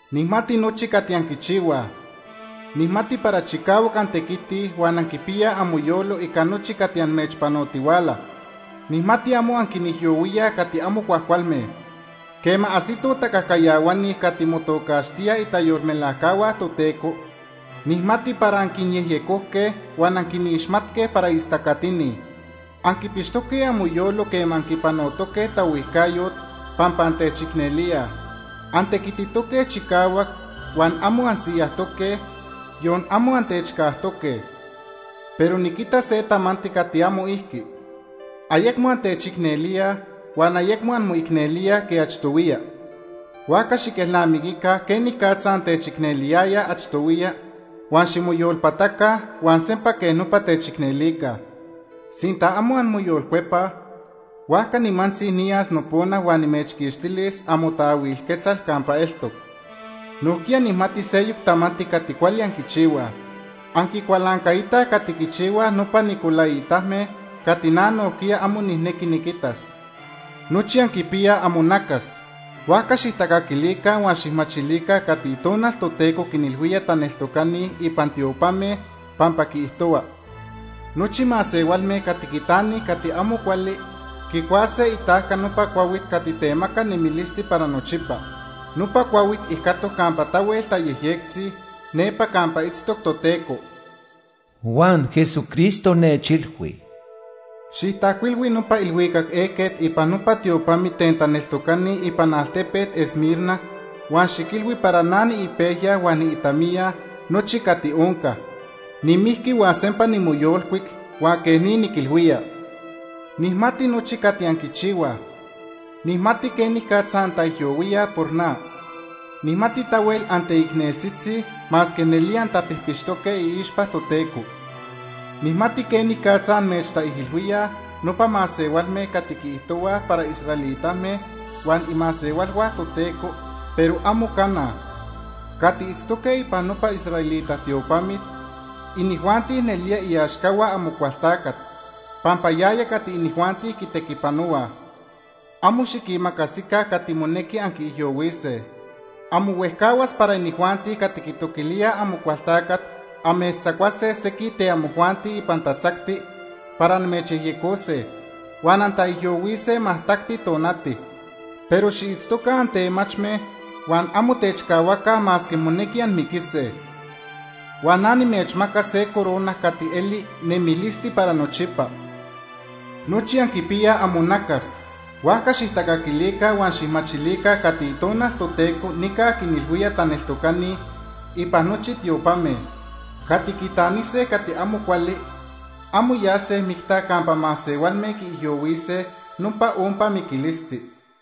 “Nijmati nochi cati anquichihuaj. Nijmati para chicahuac antequitij huan anquipiyaj amoyolo ica nochi cati amechpanotihuala. Nijmati amo anquinijyohuíaj cati amo cuajcualme. Quema ajsitoj tacajcayahuani cati motocaxtíaj itayolmelajcahua Toteco, nijmati para anquinyejyecojque huan anquinixmatque para istacatini. Anquipixtoque amoyolo quema anquipanotoque taohuijcayot pampa antechicnelíaj. Antequititoque chicahuac huan amo ansiyajtoque, yon amo antechcajtoque. “Pero niquita se tamanti cati amo ijqui. Ayecmo antechicnelíaj huan ayecmo anmoicnelíaj quej achtohuiya. Huajca xiquelnamiquica quenicatza antechicneliyayaj achtohuiya huan ximoyolpataca huan sempa quej nopa techicnelica. Sinta amo anmoyolcuepaj, huajca nimantzi niyas nopona huan nimechquixtilis amotaahuil quetzal campa eltoc. Nojquiya nijmati seyoc tamanti cati cuali anquichihuaj. Anquicualancaitaj cati quichihuaj nopa nicolaitame cati na nojquiya amo nijnequi niquitas. “Nochi anquipiyaj amonacas, huajca xijtacaquilica huan xijmachilica cati Itonal Toteco quinilhuía taneltocani ipan tiopame, pampa quiijtohua: Nochi masehualme cati quitanij cati amo cuali quicuase itajca nopa cuahuit cati temaca nemilisti para nochipa. Nopa cuahuit ijcatoc campa tahuel tayejyectzi nepa campa itztoc Toteco.” Huan Jesucristo nechilhui: “Xijtajcuilhui nopa ilhuicac ejquet ipan nopa tiopamit ten taneltocani ipan altepet Esmirna huan xiquilhui para na niipejya huan niitamiya nochi cati onca. Nimijqui huan sempa nimoyolcuic huan quej ni niquilhuía: “Nijmati nochi cati anquichihuaj. Nijmati quenicatza antaijyohuíaj por na. Nijmati tahuel anteicneltzitzi, masque nelía antapijpixtoque iixpa Toteco. Nijmati quenicatza amechtaijilhuíaj nopa masehualme cati quiijtohuaj para israelitame huan imasehualhua Toteco, pero amo cana. Cati itztoque ipan nopa israelita tiopamit, inijuanti nelía iaxcahua Amocualtacat pampa yaya cati inijuanti quitequipanohuaj. Amo xiquimacasica cati monequi anquiijyohuise. Amo huejcahuas inijuanti cati quitoquilíaj Amocualtacat amechtzacuase sequij ten amojuanti ipan tatzacti para amechyejyecose, huan antaijyohuise majtacti tonati. Pero xiitztoca antemachme huan amo techcahuaca masque monequi anmiquise. Huan na nimechmacas se corona cati eli nemilisti para nochipa. “Nochi anquipiyaj amonacas, huajca xijtacaquilica huan xijmachilica cati Itonal Toteco nica quinilhuía taneltocani ipan nochi tiopame. Cati quitanise cati amo cuali amo yase micta campa masehualme quiijyohuise nopa ompa miquilisti.”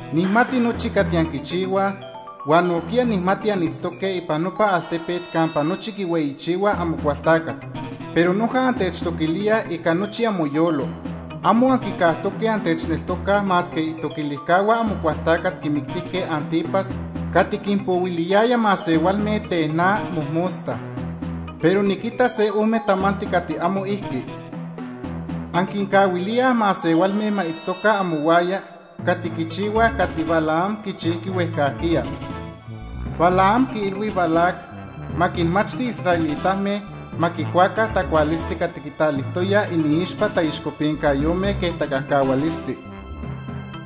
“Nijmati nochi cati anquichihuaj huan nojquiya nijmati anitztoque ipan nopa altepet campa nochi quihueyichihuaj Amocualtacat. Pero noja antechtoquilíaj ica nochi amoyolo. Amo anquicajtoque antechneltocaj masque itoquilijcahua Amocualtacat quimictijque Ántipas cati quinpohuiliyaya masehualme ten na mojmosta. “Pero niquita se ome tamanti cati amo ijqui. Anquincahuilíaj masehualme ma itztoca amohuaya cati quichihuaj cati Balaam quichijqui huejcajquiya. Balaam quiilhui Balac ma quinmachti israelitame ma quicuaca tacualisti cati quitalijtoyaj iniixpa taixcopincayome quej tacajcahualisti.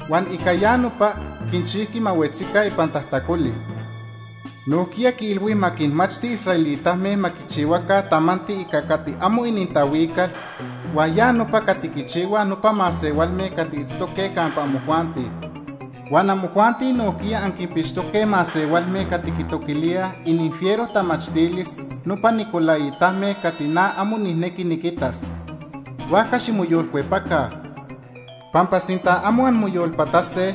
Huan ica ya nopa quinchijqui ma huetzica ipan tajtacoli. Nojquiya quiilhui ma quinmachti israelitame ma quichihuaca tamanti ica cati amo inintahuical, huan ya nopa cati quichihuaj nopa masehualme cati itztoque campa amojuanti. Huan amojuanti nojquiya anquinpixtoque masehualme cati quitoquilíaj ininfiero tamachtilis nopa nicolaitame cati na amo nijnequi niquitas. Huajca ximoyolcuepaca, pampa sinta amo anmoyolpatase,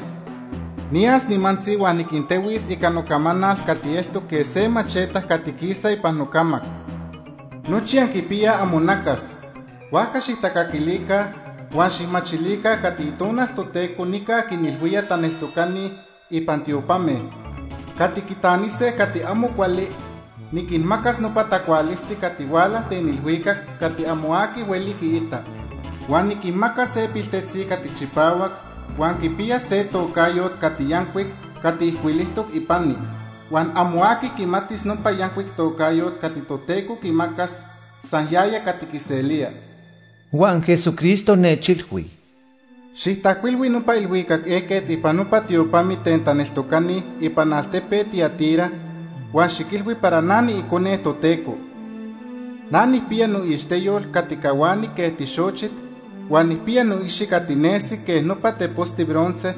niyas nimantzi huan niquintehuis ica nocamanal cati eltoc quej se macheta cati quisa ipan nocamac. “Nochi anquipiyaj amonacas, huajca xijtacaquilica huan xijmachilica cati Itonal Toteco nica quinilhuía taneltocani ipan tiopame. Cati quitanise cati amo cuali niquinmacas nopa tacualisti cati huala ten ilhuicac cati amo aqui hueli quiita. Huan nijmacas se piltetzi cati chipahuac huan quipiyas se tocayot cati yancuic cati ijcuilijtoc ipani huan amo aqui quimatis nopa yancuic tocayot cati Toteco quimacas, san yaya cati quiselía.” Huan Jesucristo nechilhui: “Xijtajcuilhui nopa ilhuicac ejquet ipan nopa tiopamit ten taneltocani ipan altepet Tiatira huan xiquilhui para na niIcone Toteco. Na nijpiya noixteyol cati cahuani quej tixochit huan nijpiya noicxi cati nesi quej nopa teposti bronce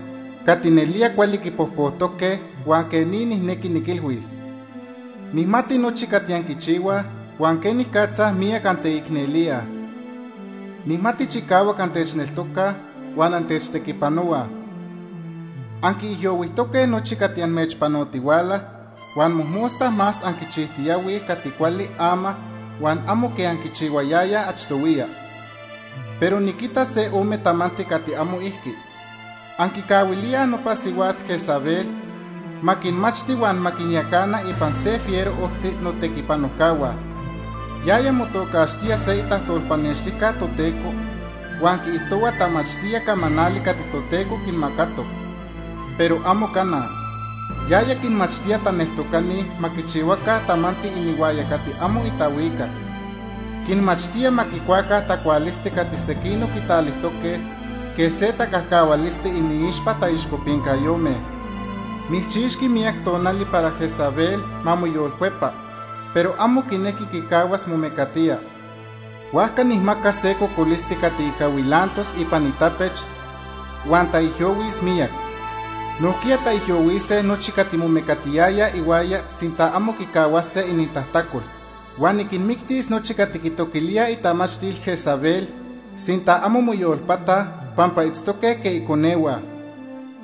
cati nelía cuali quipojpojtoque huan quej ni nijnequi niquilhuis: “Nijmati nochi cati anquichihuaj huan quenicatza miyac anteicnelíaj. Nijmati chicahuac antechneltocaj huan antechtequipanohuaj. Anquiijyohuijtoque nochi cati amechpanotihuala, huan mojmosta más anquichijtiyahuij cati cuali ama huan amo quej anquichihuayayaj achtohuiya. “Pero niquita se ome tamanti cati amo ijqui. Anquicahuilíaj nopa sihuat Jezabel ma quinmachti huan ma quinyacana ipan se fiero ojti notequipanojcahua. Yaya motocaxtía se itajtolpanextijca Toteco huan quiijtohua tamachtía camanali cati Toteco quimacatoc, pero amo cana. Yaya quinmachtía taneltocani ma quichihuaca tamanti inihuaya cati amo itahuical. Quinmachtía ma quicuaca tacualisti cati sequinoc quitalijtoque quej se tacajcahualisti iniixpa taixcopincayome. Nijchixqui miyac tonali para Jezabel ma moyolcuepa, pero amo quinequi quicahuas momecatía. Huajca nijmacas se cocolisti cati ica huilantos ipan itapech huan taijyohuis miyac. Nojquiya taijyohuise nochi cati momecatiyayaj ihuaya sinta amo quicahuase inintajtacol. Huan niquinmictis nochi cati quitoquilíaj itamachtil Jezabel, sinta amo moyolpataj, pampa itztoque quej iconehua.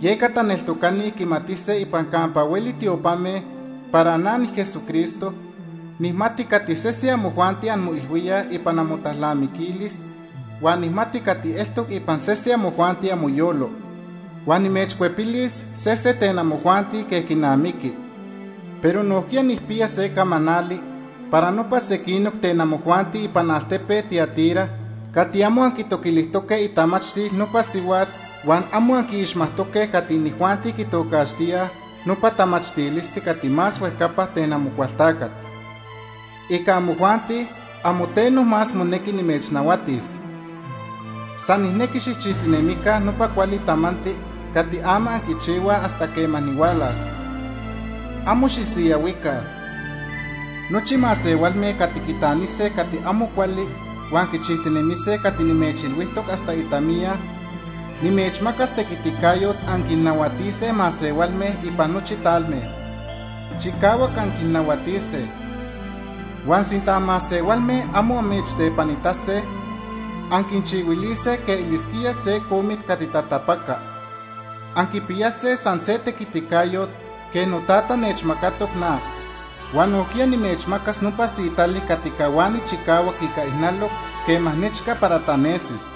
Yeca taneltocani quimatise ipan campa hueli tiopame para na, niJesucristo, nijmati cati sese amojuanti anmoilhuíaj ipan amotalnamiquilis huan nijmati cati eltoc ipan sese amojuanti amoyolo. Huan nimechcuepilis sese ten amojuanti quej quinamiqui. Pero nojquiya nijpiya se camanali para nopa sequinoc ten amojuanti ipan altepet Tiatira cati amo anquitoquilijtoque itamachtil nopa sihuat huan amo anquiixmajtoque cati inijuanti quitocaxtíaj nopa ‘tamachtilisti cati más huejcapa’ ten Amocualtacat. Ica amojuanti amo teno más monequi nimechnahuatis. San nijnequi xijchijtinemica nopa cuali tamanti cati ama anquichihuaj hasta quema nihualas. Amo xisiyahuica. “Nochi masehualme cati quitanise cati amo cuali huan quichijtinemise cati nimechilhuijtoc hasta itamiya, nimechmacas tequiticayot anquinnahuatise masehualme ipan nochi talme. Chicahuac anquinnahuatise. Huan sinta masehualme amo amechtepanitase, anquinchihuilise quej elisquía se comit cati tatapaca. Anquipiyase san se tequiticayot quej noTata nechmacatoc na. Huan nojquiya nimechmacas nopa sitali cati cahuani chicahuac ica ijnaloc quema nechca para tanesis.